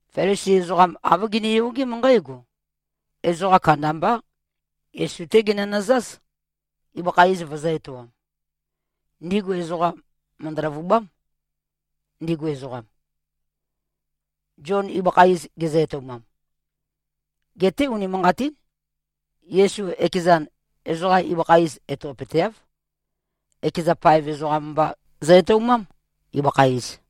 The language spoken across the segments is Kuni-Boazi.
Felisi ezoqam āv giniyogém nqǽgo: Ezoqa kandambá, Yesu-té ginønøzáz, ibøkha iz vøzø̄-etoam. Ndigu ezoqa mø̀ndø-løvubám, ndigu ezoqam, Zion ibøkha iz gezø-etoumam. (Geté unimanqatín, Yesu ekezan, ezoqa ibøkha iz etopøteáv. Ekeza paev ezoqam mba zø-etoumám, ibøkha iz.)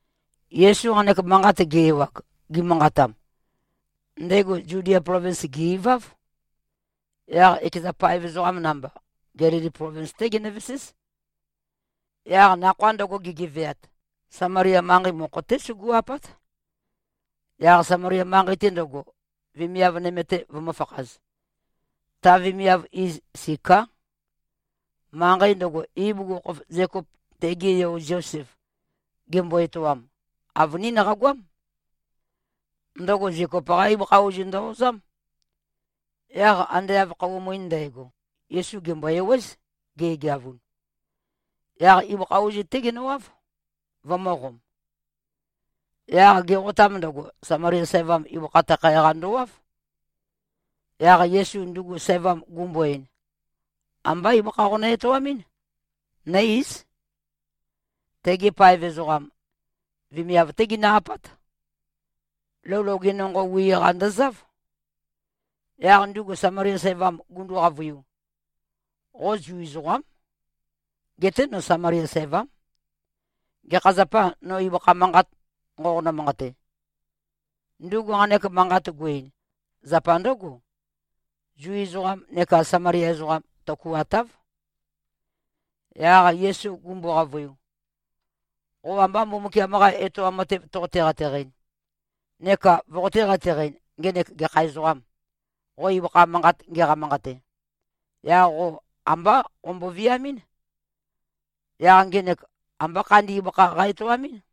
Yesu nqanek manqat ge-ewag, gimanqatam, ndego Zudia plovins gè-iváv. Yaq ekeza paev ezoqa namba, Gelili plovins-té ginøveséz. Yaq nakhoa ndøgo gegeveat, Samalia manqei mokho-té sugu꞉-apát, yaq Samalia manqei-te ndøgo, vemiav nøme-te vømø̄fakhaz. Taqa vemiav iz Siká. Manqei ndøgo, ibugukhokhof Zekop tege yo Zosef gembo-etoam, avønín qagoám. Ndøgo Zekop-qá ibøkha ozu ndø-ozám. Yaq ande av khøuwa muin ndægo, Yesu gèmbo-ewéz, ge꞉geavun. Yaq ibøkha ozu-té genøwáv, vømø̄qom. Yaq geqotam ndøgo, Samalia sævam ibøkha takhae-qa ndowáv. Yaq Yesu ndugu sævam gumbo-ein, “Ambá ibøkha qonø-etoamɨ́n. Nǿ-íz.” (Tegi paev ezoqam, vemiav-té ginø-apát. Lou loge nonqo wi-qa ndøzáv.) Yaq ndugu Samalia sævam gundu-qavøiu, “Qo Zu ezoqám. Geté no Samalia sævám. Gekha zapâ, no ibøkha manqat nqoqonø-manqate?” Ndugu nqanek manqat gu-ein, zapa ndǿgo: Zu ezoqam neka Samalia ezoqam, tøkuatáv. Yaq Yesu gumbo-qavøiu, “Qo amba Mbumbukiam-qa etoam matev toqote-qateqɨn, neka voqotē-qateqɨn, ngenek gekha ezoqām, qo ibøkha manqat ngeqa-manqate, yaq qo ambá qombo-viamɨ́n, yaq ngenek ambá khandi ibøkha qa-etoamɨ́n.”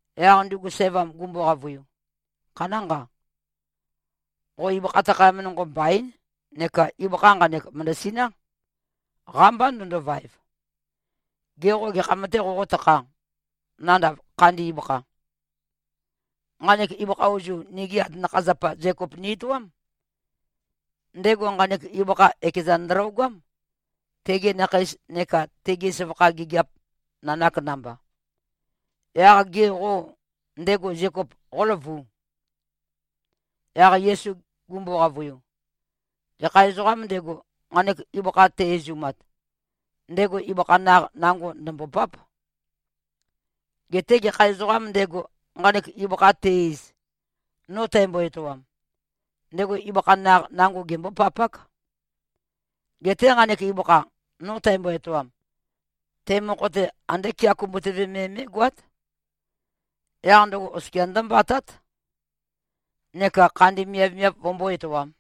Yaq ndugu sævam gumbo-qavøiu, “Khanánqa. Qo ibøkha takhayam nonqo mbaín neka ibøkha nqanek mø̀ndøsiná. Qámbá ndøndovaev. Gê, qo gekham-tē qoqótakhā, nandav khandi ibøkha? Nqanek ibøkha ozu, nigi atanakha-zapa Zekop ni-etoám. Ndego nqanek ibøkha ekezan ndølogám, tegi nakheis neka tegi søvakha gigiap nanak namba. Yaq gê, qo ndego Zekop qóløvu?” Yaq Yesu gumbo-qavøiu, “Gekha ezoqām ndego, nqanek ibøkha te-izumat, ndego ibøkha naq nango ndø̀mbopáp. Geté gekha ezoqām ndego, nqanek ibøkha te-iz, no tæmbo-etoam, ndego ibøkha naq nango gembópapák. Geté nqanek ibøkha, no tæmbo-etoam, te mokho-te andé kea kumbutøve me mé꞉goát. Yaq ndøgo oskia ndómbatát, neka khandi miavmiav vømbó-etoām.”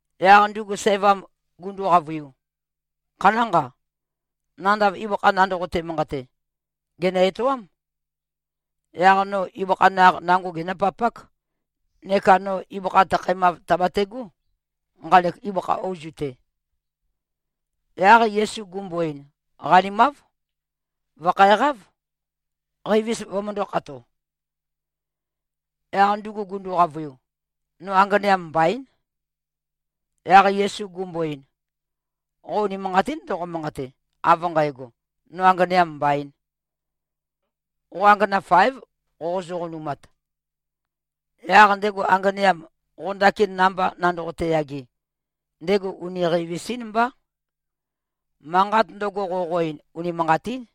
Yaq ndugu sævam gundu-qavøiu, “Khanánqa. Nandav ibøkha nandoqote-manqate, gènø-etoám. Yaq no ibøkha naq nango genǿpapák, neka no ibøkha takhaemav tàbategó, nqanek ibøkha ozu-te.” Yaq Yesu gumbo-ein, “Qanimáv. Vø̀khæqáv, qeivis vømøndō-khato.” Yaq ndugu gundu-qavøiu, “No anganeam mbaín.” Yaq Yesu gumbo-ein, “Qo unimanqatín ndoqo-manqate, av nqægo, ‘No anganeam mbaīn.’ Qo angana fáev, qoqozø-qonumat. Yaq ndego anganeam, qo ndakin namba nandoqote-yage, ndego uni qeivis-ín mbá. Manqat ndøgo, qoqo-ein, unimanqatín.”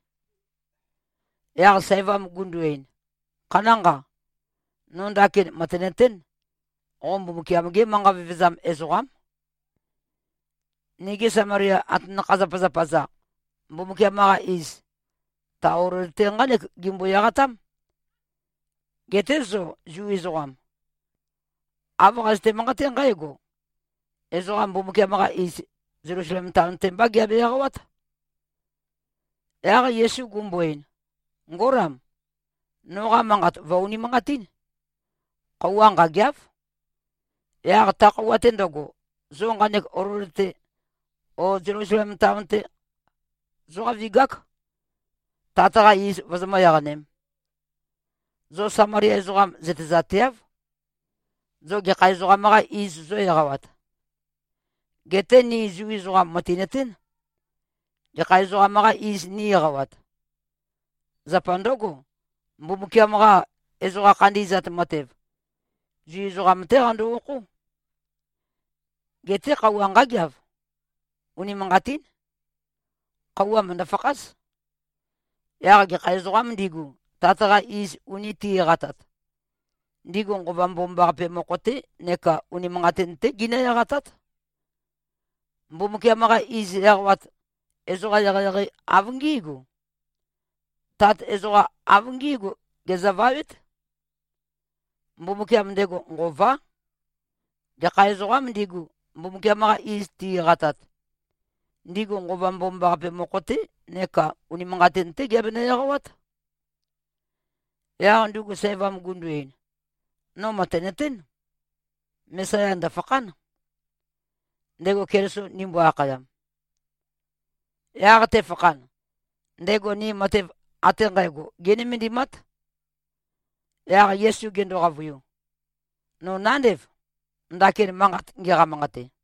Yaq sævam gundu-ein, “Khanánqa. No ndakin mø̀tenøtén, qo Mbumbukiam-gé manqa vevezam ezoqám. Nigi Samalia atanakha-zapazapa-za, Mbumbukiam-qa iz, ta olol-te nqánek gimbo-eqatám. Geté zo Zu ezoqam, āv qazøte-manqaté nqǽgo, ‘Ezoqa Mbumbukiam-qa iz, Zelusalem taon-te mbá giabe-eqawát.’” Yaq Yesu gumbo-ein, “Ngólam! Noqa manqat vø̀-unimanqatín. Khøuwa nqâgeáv. Yaq ta khøuwa-te ndøgo, zo nqanek olol-te o Zelusalem taon-te zóqavigák, Tat-qa iz vozomǿ-eqanēm. Zo Samalia ezoqam zøtezateáv, zo gekha ezoqam-qā iz zō-eqawat. Geté ni Zu ezoqam mø̀tinøtén, gekha ezoqam-qā iz nī-eqawat. Zapa ndǿgo, Mbumbukiam-qa ezoqa khandi꞉zat matev, Zu ezoqam-té qando-okhó. Geté khøuwa nqágeav. Unimanqatín. Khøuwa mø̀ndø-fakház. Yaq gekha ezoqām ndigu, Tat-qa iz uni ti꞉-eqatat, ndigu Nqova Mbomambaqape mokho-té neka unimanqatin-té ginǿ-eqatát. Mbumbukiam-qa iz eqawat ezoqam eqeieqei av ngí꞉gu. Tat ezoqam av ngí꞉gu gezøvawét. Mbumbukiam ndego Nqová. Gekha ezoqām ndigu, Mbumbukiam-qa iz ti-eqatat, ndigu Nqova Mbomambaqape mokho-té neka unimanqatin-té giabenø-eqawát.” Yaq ndugu sævam gundu-ein, “No mø̀tenøtén, Mesaya ndø̀fakhán, ndego Keliso ndimbo-akhayam. Yaq tefakhan, ndego ni matev ate nqægo génømendimát.” Yaq Yesu gendo-qavøiu, “No nándev, ndakin manqat ngeqa-manqate.”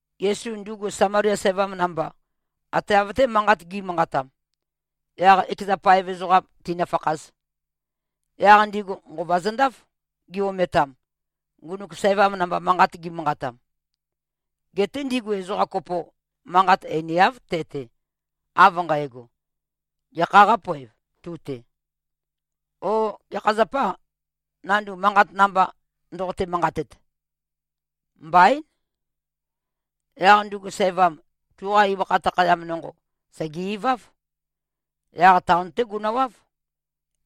Yesu ndugu Samalia sævam namba, ate av-té manqat gi꞉manqatam, yaq ekeza paev ezoqam tīnø̄fākhāz. Yaq ndigu nqova zøndáf, gi-ometam, ngunuk sævam namba manqat gimanqatam. Geté ndigu ezoqa kopo, manqat einiáv te-te, av nqægo, “Gekhā qápoev, tu-te?” ó “Gekha zapâ, nandu manqat namba ndoqotē-manqatet?” Mbaín. Yaq ndugu sævam, tuqa ibøkha takhayam nonqo sège-iváv. Yaq taon-té gunøwáv,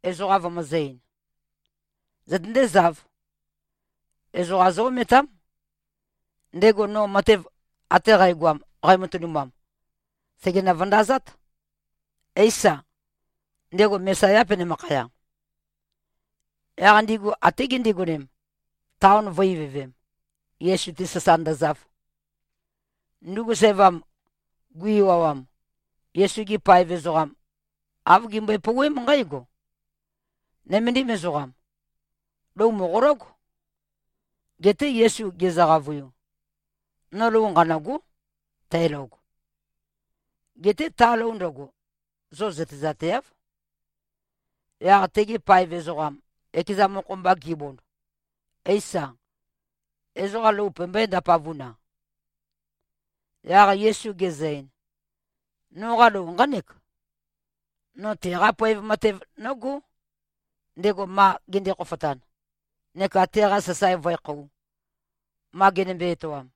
ezoqa vømøzø̄-ein, “Zøtøndézāv. Ezoqa zó-ometám. Ndego no matev ate qægoam, qæmatønumam, sègenø-vøndazát. Éisa, ndego Mesayâ, penømakhaya?” Yaq ndigu até gindigonem, taon vø̄-ivøvem, Yesu-te sasa ndøzav. Ndugu sævam gui-ewawam, Yesu-gi paev ezoqam āv gimbøe-pouwém nqǽgo, “Nøméndim ezoqam. Lou mòqológ.” Geté Yesu gezø-qavøiu, “No lou nqanø̂gó, tælog. Geté ta lou ndøgo, zo zøtezateáv.” Yaq tegi paev ezoqam, ekeza mokho-mba gibond, “Éisa? Ezoqa lou pømbøé-ndapavun-a?” Yaq Yesu gezø-ein, “Noqa lou nqánek: No teqá poev matev nógó, ndego ma gende-khofotan, neka teqa sasae vǿekhōu, ma genømbe-etoam.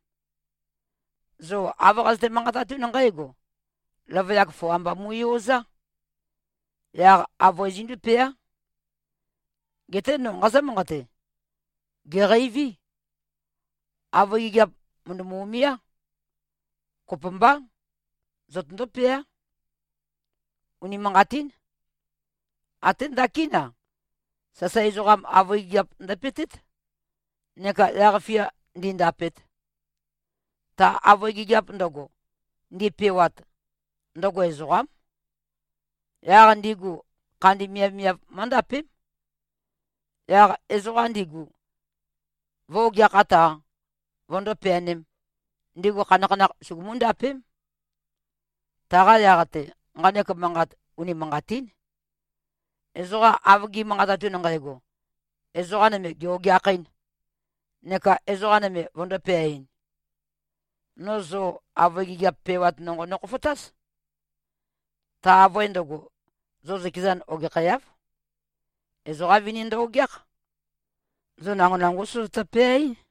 Zo āv qazøte-manqatatún nqǽgo, ‘Løvøyak foa mba mu꞉yozá. Yaq avøe zindúpeá.’ Geté no nqazǿ-manqate: Gèqeiví. Avøe gigiap mø̀ndømu-umiá. Kopømbá. Zotøndó-peá. Unimanqatín. Até ndakín-a, sasae ezoqam avøe gigiap ndøpe꞉tét, neka yaq-fia ndīndāpēt. Ta avøe gigiap ndøgo, ndipewat, ndøgo ezoqám. Yaq ndigu khandi miavmiav mǿndapém. Yaq ezoqa ndigu vǿ-ogeakhāt-a, vøndó-peanēm, ndigu khanakhanakh sugumú-ndapém. Taqa yaq-te, nqanek manqat unimanqatín, ezoqa av gi꞉manqatatun nqægo: Ezoqa nøme gè-ogeakhɨ́n, neka ezoqa nøme vøndō-peaɨn. No zo avøe gigiap pewat nonqo nokhofotáz. Ta avøe ndøgo, zo zøkezan ogekhæáv. Ezoqa vini ndø-ogeákh. Zo nango nangó sozotø-peaɨ́n.”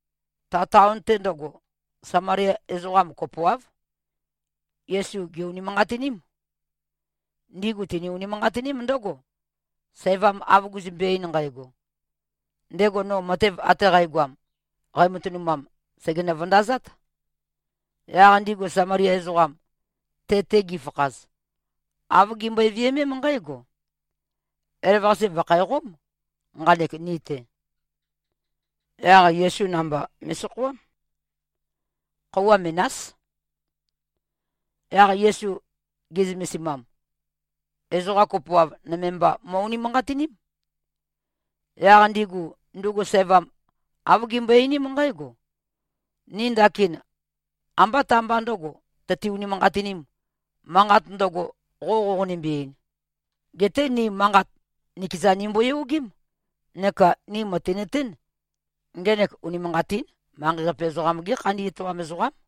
Ta taon-te ndøgo, Samalia ezoqa kopoáv, Yesu gè-unimanqatiním. Ndigu tini-unimanqatiním ndǿgo, sævam av guzømbe-ein nqægo, “Ndego no matev ate qægoam, qæmatønumam, sègenø-vøndazát.” Yaq ndigu Samalia ezoqam, te-te gifakhaz, āv gimbøe-viømém nqǽgo, “Elavøqase vø̀khæqóm nqanek, ni-te.” Yaq Yesu namba me꞉sokhoám. Khøuwa menás. Yaq Yesu ge꞉zømesimam, ezoqa kopoav nøme mba mo꞉-unimanqatiním. Yaq ndigu, ndugu sævam āv gimbøe-einím nqǽgo, “Ni ndakin ambá ta-mba ndø̄go tøti-unimanqatinīm, manqat ndøgo, qo qoqonimbi-ein. Geté ni manqat nikezan nimboyogém neka ni mø̀tinøtén, ngenek unimanqatín manqei-qape ezoqam-gé khandi etoam ezoqám.”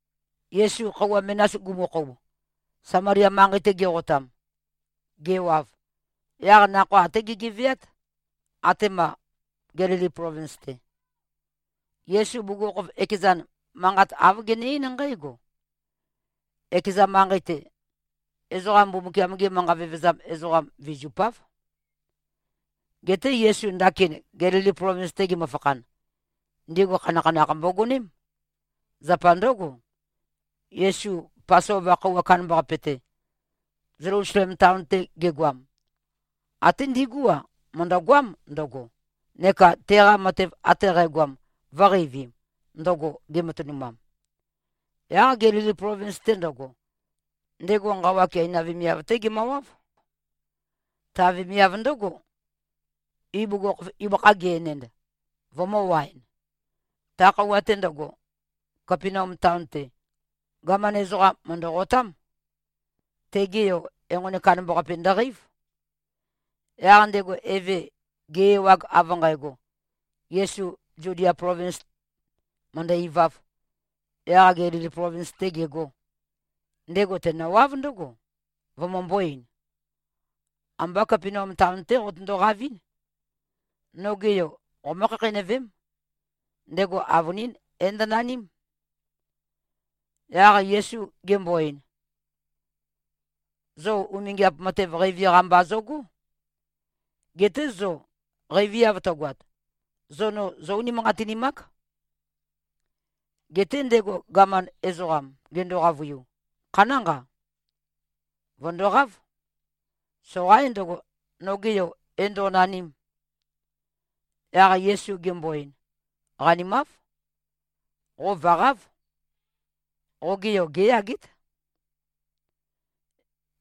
Yesu khøuwa menas gumukhoub, Samalia manqei-te geqotam, gewav, yaq nakhoa até gegeveát, atema Gelili plovins-te. (Yesu bugukhokhof ekezan, manqat āv gene-eín nqǽgo, “Ekeza manqei-te, ezoqa Mbumbukiam-ge manqa vevezam ezoqam vizupáv.”) Geté Yesu ndakin Gelili plovins-te gemøfakhan, ndigu khanakhanakh mbogoném. Zapa ndǿgo, Yesu Pasova khøuwa kandambaqape-te, Zelusalem taon-te gegoam, até ndigú-a, mø̀ndøgoám ndøgo, neka teqa matev ate qægoam vø̄qeivim, ndøgo gematønumam. Yaq Gelili plovins-te ndøgo, ndego nqawa Keina vemiav-té gemøwáv. Ta vemiav ndǿgo, ibugukhokhof ibøkha ge-enend, vømø̄-waen. Ta khøuwa-te ndøgo, Kapenaum taon-te, gaman ezoqam mø̀ndøqotám. Tege yo, enqoni kandambaqape ndøqeív. Yaq ndego eve, ge-ewag av nqægo, Yesu Zudia plovins mø̀ndø-ivāv, yaq Gelili plovins-tē gegō, ndego tenøwáv ndǿgo, vømømbō-ein, “Ambá Kapenaum taon-tē qotøndo-qavɨ̄n. Noge yo qomǿ-khakheinøvém. Ndego avønín é-ndønaním.” Yaq Yesu gembo-ein, “Zo umingiap matev qeivi-qa mba zogó. Geté zo qeiviav tøgoat, zo no zó-unimanqatinimák.” Geté ndego gaman ezoqam gendo-qavøiu, “Khanánqa. Vø̀ndoqáv! Soqaín ndøgo, noge yo é-ndo꞉naním.” Yaq Yesu gembo-ein, “Qanimáv. Qo vø̀qáv. Qoge yo géyagét.”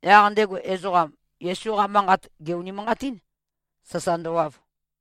Yaq ndego ezoqam, Yesu-qa manqat gè-unimanqatín, sasa ndøwav.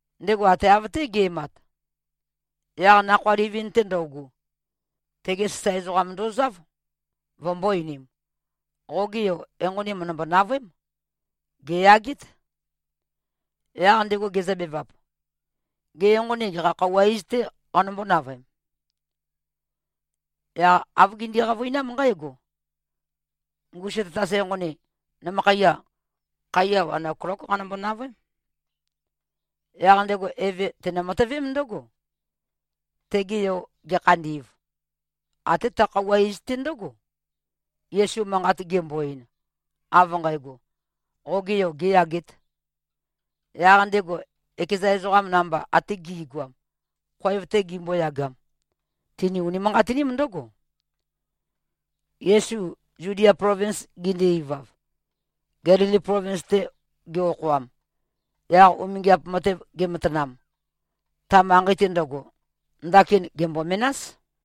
Ndego ate av-té ge꞉mat, yaq nakhoa livin-te ndøugu, tegi sasae ezoqam ndozáv, vømbō-einim, “Qoge yo, enqoni mø̀ndømbo-navøém. Gèyagét.” Yaq ndego gezøbevap, “Gê, enqoni gekha khøuwa iz-tē qanømbó-navøem?” Yaq āv gindi-qavøinám nqǽgo, “Ngusu tatas enqoni, nømøkhaiya, khaiya wan oklók qanømbo-navøém.” Yaq ndego eve tenø-matøvém ndǿgo. Tege yo gekhandi꞉v, até ta khøuwa iz-té ndǿgo, Yesu manqat gembo-ein, av nqægo, “Qoge yo gēyagēt.” Yaq ndego, ekeza ezoqa namba ate gi꞉goam, khoev-te gimboyagam, tini-unimanqatiním ndǿgo. Yesu Zudia plovins gende-ivav, Gelili plovins-te ge-okhoam, yaq umingiap matev gematanam, ta manqei-te ndøgo, ndakin gèmbo-menás.